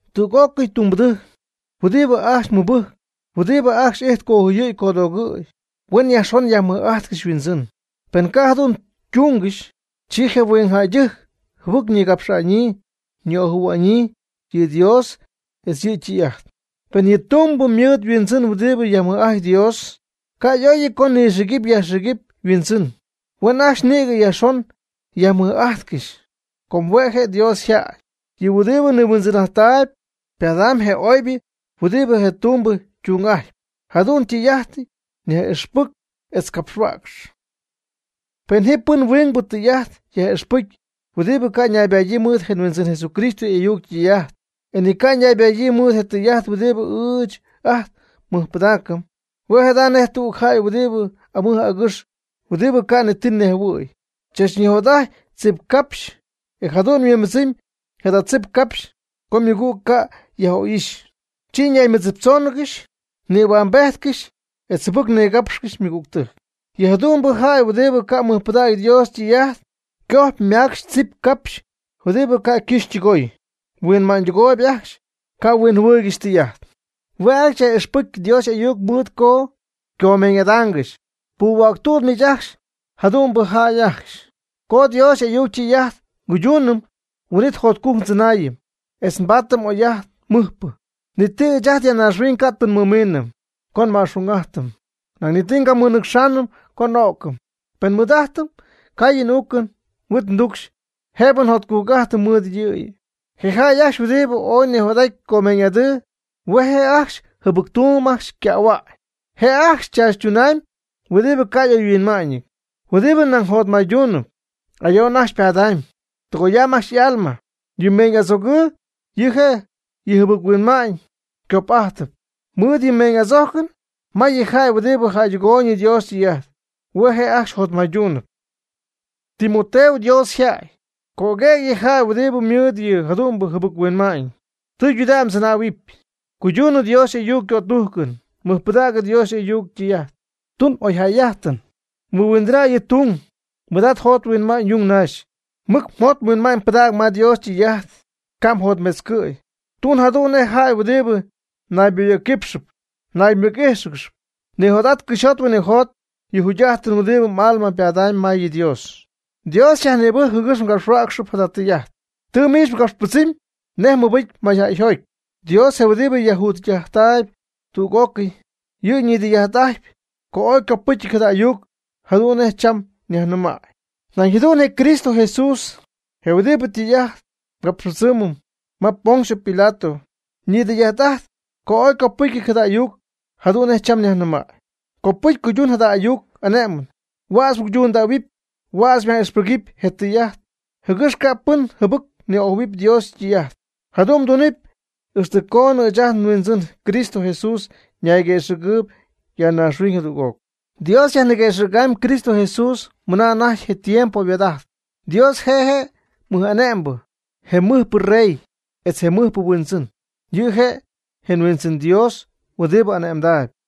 Tüg'ócɨy tumbɨdɨjc huɨdibɨ ajcxy mɨbɨjcp huɨdibɨ ajcxy ijtp cojuyɨ̈y codoogɨ̈y, huen yajxon yajmɨj'ajtcɨxy yhuindzɨn. Pen ca' jadu'n tungɨxy, chi je huingjäydɨjc jɨbɨc nigapxaanɨ ni'ojɨ̈huaanɨ yɨ Dios etz yɨ' ytɨy'ajt. Pen yɨ tumbɨ mɨɨd yhuindzɨn huɨdibɨ yajmɨj'ajtp Dios, ca' y'oyɨty co nɨxïgɨpy yajxïgɨpy yhuindzɨn. Huen ajcxy nïgɨ yajxon yajmɨj'ajtcɨxy, com hue' je' Dios yjäy. Yɨ huɨdibɨ nihuindzɨn'ajt ypadamyb je oybɨ huɨdibɨ je' ytumbɨ ytung'ajtpy. Jada tɨy'ajt yaj'ixpɨc etz capxhuäcx. Pen ji pɨn huingbɨ tɨy'ajt yaj'ixpɨcy huɨdibɨ ca' ñaybadyii mɨɨd je Huindzɨn Jesucristo y'ayuc ytɨy'ajt, e ni ycanaybadyii mɨɨd je tɨy'ajt huɨdibɨ ɨɨch ajt nmɨjpɨdaacɨm, hue' jada nej tüg jäy huɨdibɨ amɨj agɨxɨp huɨdibɨ ca' ni ti nejhuɨ̈y. Chachnijot'aty tzip capx, e jadu'n yhuimbɨdzɨmy jada tzip capxy co mɨgüg ca' yaj'oy'ixy, chi ñaymɨdziptzoongɨxy nïhuambejtcɨxy etz jɨbɨc nigapxcɨxy ymɨgügtɨjc. Yɨ jadu'mbɨ jäy huɨdibɨ ca' mɨjpɨdägy Dios ytɨy'ajt cojpy ymacxpy tzip capxy huɨdibɨ ca' ycɨxy ytɨgoy. Yhuinma'ñydɨgoy ajcxy, ca' huinjɨhuɨɨygɨxy tɨy'ajt. Hue' ajcxy yaj'ixpɨcy Dios y'ayuc mɨɨd co ycomeeñ'adaangɨxy. Puhuäctuut miich jadu'mbɨ jäy ajcxy. Co Dios y'ayuc ytɨy'ajt nguydunɨm, huin'it jotcujc ndzɨnaayɨm, etz nbaatɨm oy'ajt mɨjpɨ. Ni ti ɨɨch ajt ya naaxhuiñ ca' tɨ nmɨmiinɨm co nma'xung'ajtɨm, nañ ni ti ngamɨnɨcxɨm co n'o'cɨm. Pen nmɨɨd'ajtɨm caayɨn uucɨn huit tucxy, jëbɨ njotcujc'ajtɨm mɨɨd yɨ'yɨ. Je' ajcxy huɨdibɨ ooy nijot'aty comeeñ'adɨɨ, hue' je' ajcxy jɨbɨc tumb ajcxy ycähua'ñ. Je' ajcxy chachtunamyb huɨdibɨ ca' oyhuinma'ñɨty, huɨdibɨ nayjotmayduunɨp. Ayo'n ajcxy ypadamyb, tɨgoyamb ajcxy y'alma. Yɨ meeñy'adzojcɨn yɨ' je' yɨ jɨbɨc-huinma'ñ cop'ajtɨp. Mɨɨd yɨ meeñy'adzojcɨn may yɨ jäy huɨdibɨ jäydɨgoy Dios ytɨy'ajt. Hue' je' ajcxy nayjotmayduunɨp. Timoteo, Dios yjäy, cöguëg yɨ jäy huɨdibɨ mɨɨd yɨ jadu'mbɨ jɨbɨc-huinma'ñ. Tɨydudägy mdzɨnähuɨpy, cuydunɨ Dios y'ayuc ycötujcɨn, mɨjpɨdäg Dios y'ayuc ytɨy'ajt, tun oyjäy'ajtɨn, mɨhuindɨna' yɨ tung, mɨɨd'at mjot mhuinma'ñ yung naxy. Mɨc mjot mhuinma'ñ pɨdäg ma Dios ytɨy'ajt, ca' mjotmetzcɨ̈y. Tun jadu'n nej jäy huɨdibɨ nayboyɨ̈cquípxɨgɨxy naymɨc'íjxɨgɨxy. Nijot'at cɨxyjot huinɨjot yɨ jugy'ajtɨn huɨdibɨ m'alma ypadamyb ma Dios. Dios xyajnïbɨcy jɨgɨx mgapxhuäcxɨp jada tɨy'ajt. Tɨ miich mgapxypɨdzɨmy nej mmɨbɨcy mayjäyjoty. Dios je huɨdibɨ yajjugy'ajttaayb tüg'ócɨy, yɨ' nidɨy'ajt'aty co ooy ycopɨcyɨty jada ayuc jadu'n nej cham nyajnɨmaayb. Nañ jadu'n je Cristo Jesús je huɨdibɨ tɨy'ajt capxypɨdzɨm ma Poncio Pilato ñidɨy'ajt'ajt co oy ycopɨcyɨty jada ayuc jadu'n nej cham nyajnɨmaayb. Copɨcy cuydun jada ayuc ane'mɨn. Huädz mguydundähuɨpy, huädz myaj'ixpɨgɨpy je tɨy'ajt jɨgɨx ca' pɨn jɨbɨc ni'ojɨ̈huɨpy Dios ytɨy'ajt. Jadu'n mdunɨpy ixtɨ coonɨ ɨɨch ajt nHuindzɨn Cristo Jesús ñayguëxɨ̈gɨɨyb ya naaxhuiñ jadüg'oc. Dios yajniguëxɨ̈gamyb Cristo Jesús mɨna anajty je tiempo yhuaad'aty. Dios je' je mɨj'ane'mbɨ, je mɨjpɨ rey, etz je mɨjpɨ huindzɨn. Yɨ' je' je Huindzɨn Dios huɨdibɨ ane'mdaayb.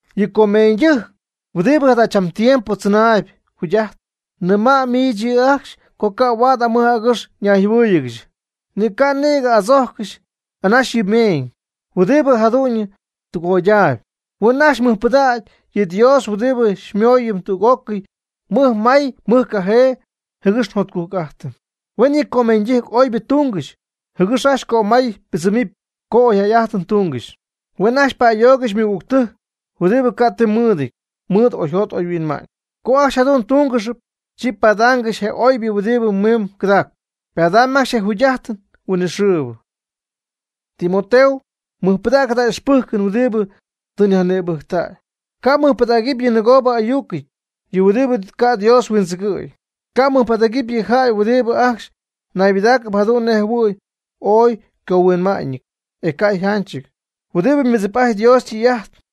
Yɨ comeeñydɨjc huɨdibɨ jadachambɨ tiempo tzɨnaayb jugy'ajt, nɨma' miich yɨ' ajcxy co ca' huaad amɨj agɨx ñayjɨhuɨ́ɨyɨgɨxy, ni ca' nïgɨ adzojccɨxy anaxy yɨ meeñ huɨdibɨ jadu'ñyɨ tɨgoydaayb. Huen ajcxy mɨjpɨdägy yɨ Dios huɨdibɨ xymooyɨm tüg'ócɨy mɨjmay mɨjcajee jɨgɨx njotcujc'ajtɨm. Huen yɨ comeeñydɨjc oybɨ tungɨxy, jɨgɨx ajcxy cömay ypɨdzɨmɨpy co oyjäy'ajtɨn tungɨxy. Huen ajcxy pa'ayoogɨxy ymɨgügtɨjc huɨdibɨ ca' ti mɨɨdɨty mɨɨd oyjot oyhuinma'ñ. Co ajcxy jadu'n tungɨxpy, chi padaangɨxy je oybɨ huɨdibɨ miimb gɨdaacp. Ypadamyb ajcxy je jugy'ajtɨn huinɨxɨɨbɨ. Timoteo, mɨjpɨdäg jada ixpɨjcɨn huɨdibɨ tɨ myajnïbɨc'aty. Ca' mmɨjpɨdägɨpy yɨ nɨgoobɨ y'ayucɨty, yɨ huɨdibɨ ca' Dios huindzɨgɨ̈y. Ca' mmɨjpɨdägɨpy yɨ jäy huɨdibɨ ajcxy naybɨdaacɨp jadu'n nej jɨhuɨ̈y ooy ycohuinma'ñɨty, e ca' yjanchɨty, huɨdibɨ mɨdzip'ajtp Dios ytɨy'ajt.